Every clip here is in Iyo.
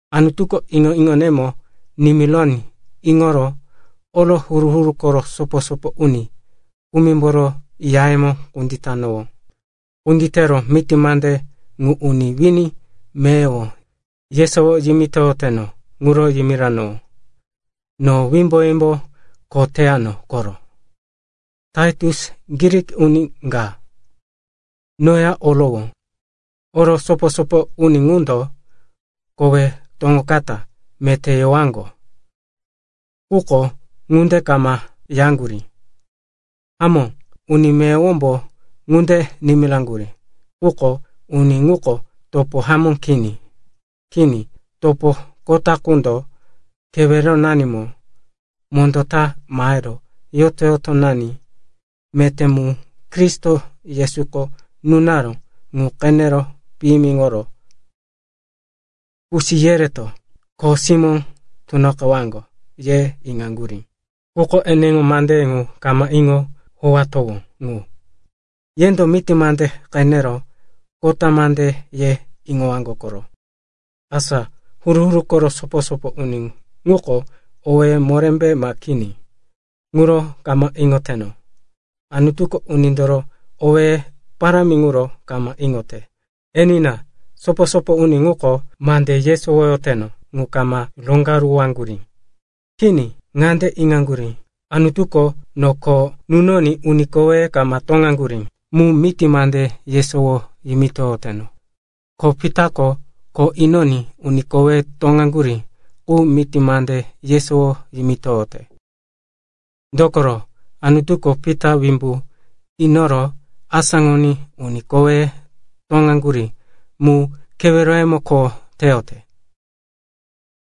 Anutuko iŋo-iŋonemo nimironí iŋoro oro huru-huru koro sopo-sopo uni kumimboro yayemo kunditanowó. Kunditero miti mande ŋu uni wini meyowo yesowo yimitoyoteno ŋuro yimiranowó. No wimbo-wimbo kho teyano koro. Taitus, Grik uni ka, noya orowó. Oro sopo-sopo uni ŋundo, “Kowí toŋokata,” meté yewaŋgo, quko ŋunde kama yaŋgurí. Hamó, uni meyowombo ŋunde nimiraŋgurí, quko uni ŋuko topo hamó kini. Kini, topo kota qundoko keweronanimo mondó ta mahero yoto-yotonani meté mu Kristo Yesuko nunaró ŋu qenero piyimiŋoro, “Kusi yereto kho simó tunoqewaŋgo,” ye iŋaŋgurí. Quko eneŋo mandeye ŋu kama iŋo howatowó ŋu. Yendo miti mande qenero, kota mande, ye iŋowaŋgo koro. Asa huru-huru koro sopo-sopo uni ŋuko owéye morémbe ma kini, ŋuro kama iŋoteno. Anutuko unindoro owéye parámi ŋuro kama iŋote. Enina, sopo-sopo uni ŋuko mande yesowoyoteno ŋu kama roŋgaruwaŋgurí. Kini, ŋande iŋaŋgurí, Anutuko no kho nunoní uni koweye kama toŋaŋgurí mu miti mande yesowo yimitoyoteno. Ko Pita kho inoní uni koweye toŋaŋgurí qu miti mande yesowo yimitoyote. Dokoro Anutuko Pita wimbu inoro asáŋoní uni koweye toŋaŋgurí mu keweroyemo kho teyote.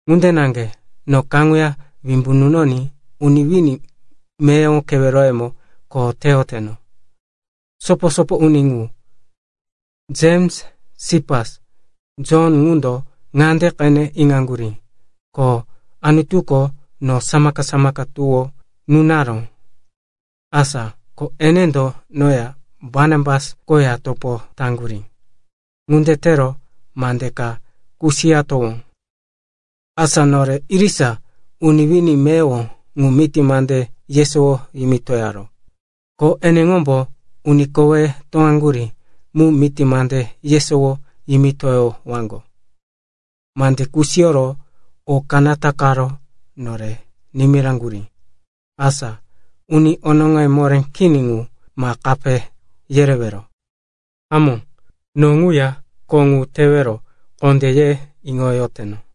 Ŋunde naŋge no ŋuya wimbu nunoní uni wini meyowo keweroyemo kho teyoteno. Sopo-sopo uni ŋu Jems, Sipas, Jon ŋundo ŋande qene iŋaŋgurí, ko Anutuko no samaka-samaka tuwó nunaró. Asa ko enendo noya Barnabas koya topo taŋgurí. Ŋunde tero mande ka kusiyatowó, asa nore irisa uni wini meyowo ŋu miti mande yesowo yimitoyowaro, ko eneŋombo uni koweye toŋaŋgurí mu miti mande yesowo yimitoyowaŋgo. Mande kusiyoro o kanata karo nore nimiraŋgurí, asa uni onoŋoye moré kini ŋu ma kape yerewero. Hamó, no ŋuya kho ŋu tewero kondé ye iŋoyoteno.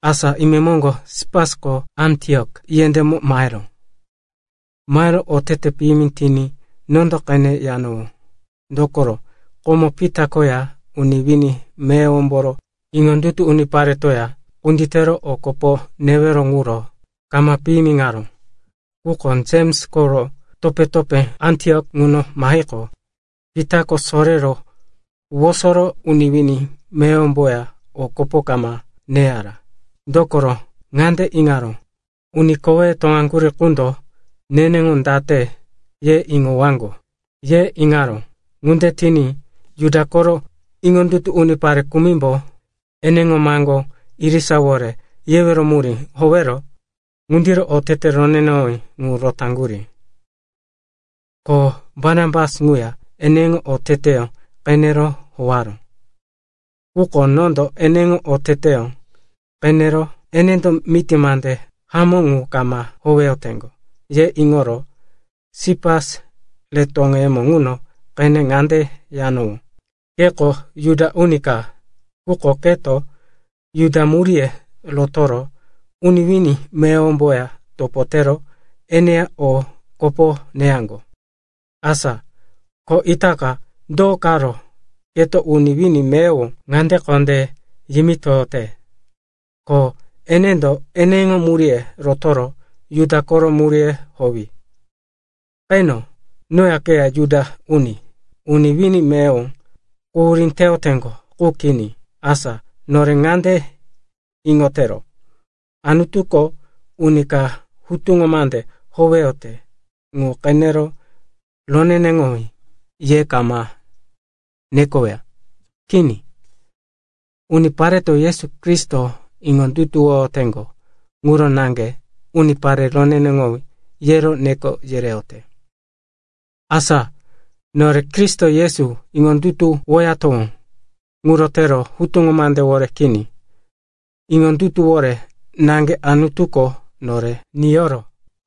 Asa imemoŋgo Sipasko Antiok yendémo maheró. Mahero otete piyimi tiní nondo qene yanowó. Dokoro komo Pita koya uni wini meyowomboro iŋondutu uniparetoya kunditero o kopo newero ŋuro kama piyimiŋaró. Quko Jems koro topé-topé Antiok ŋuno mahiqo, Pitako sorero wosoro uni wini meyowomboya o kopo kama neyara. Dokoro ŋande iŋaró, uni koweye toŋaŋgurí qundo neneŋo date ye iŋowaŋgo, ye iŋaró. Ŋunde tiní Juda koro iŋondutu unipare kumimbo eneŋo maŋgó irisawore yewero murí howero ŋundiro otete roneneŋowí ŋu rotaŋgurí. Ko Barnabas ŋuya eneŋo oteteyó qenero howaró. Quko nondo eneŋo oteteyó qenero, enendo miti mande hamó ŋu kama howeyoteŋgo, ye iŋoro Sipas re toŋeyemo ŋuno qene ŋande yanowó, “Keko Juda uni ka, quko keto Juda muríye rotoro uni wini meyowomboya topo tero eneya o kopo neyaŋgo. Asa ko itaka do karo keto uni wini meyowo ŋande kondé yimitoyote, ko enendo eneŋo muríye rotoro Juda koro muríye howi? Qeno, noya keya Juda uni, uni wini meyowo quhurí teyoteŋgo qu kini. Asa nore ŋande iŋotero, Anutuko uni ka hutuŋo mande howeyote ŋu qenero roneneŋowí ye kama nekoweya. Kini, unipareto Yesu Kristo iŋondutuwoyoteŋgo ŋuro naŋge, unipare roneneŋowí, yero neko yereyote.” Asa nore Kristo Yesu iŋondutuwoyatowó. Ŋuro tero hutuŋo mandewore kini, iŋondutuwore naŋge Anutuko nore niyoro,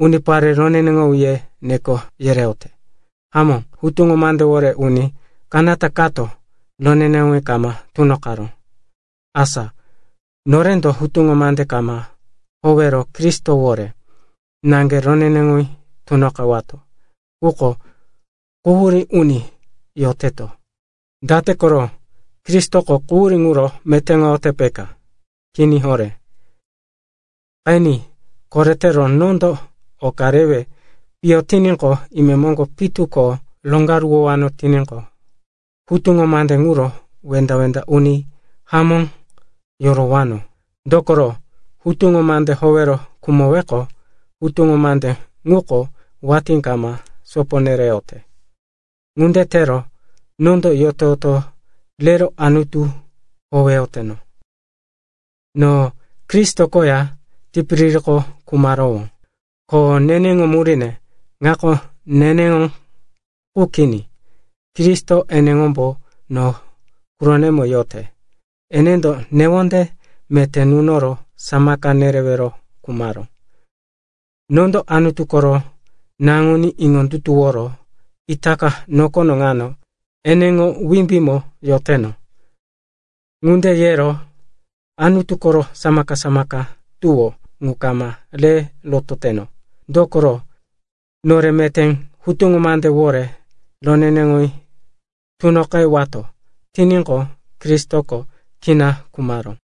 unipare roneneŋowí, ye neko nereyote. Hamó, hutuŋo mandewore uni kanata kato roneneŋowí kama tunoqaró. Asa norendo hutuŋo mande kama howero Kristowore naŋge roneneŋowí tunoqewato, quko quhurí uni yoteto. Date koro? Kristoko quhurí ŋuro metéŋoyote, peka? Kini horé. Qeni, koretero nondo oka rewe piyo tiní imemoŋgo pitu ko roŋgaruwowano tiníqo, hutuŋo mande ŋuro wenda-wenda uni hamó yorowano. Dokoro, hutuŋo mande howero khumoweqo, hutuŋo mande ŋuko watí kama sopo nereyote. Ŋunde tero nondo yoto-yoto rero Anutu howeyoteno. No Kristo koya tipiririko khumarowó, ko neneŋo muríne ŋako neneŋo qu kini, Kristo eneŋombo no quroko yote. Enendo newonde meté nunoro samaka nerewero khumaró. Nondo Anutu koro Naŋuní iŋondutuworo itaka nokono ŋano eneŋo wimbímo yoteno. Ŋunde yero Anutu koro samaka-samaka tuwó ŋu kama re rototeno. Dokoro, nore meté hutuŋo mandewore roneneŋowí tunoqewato tiníqo, Kristoko kina khumaró.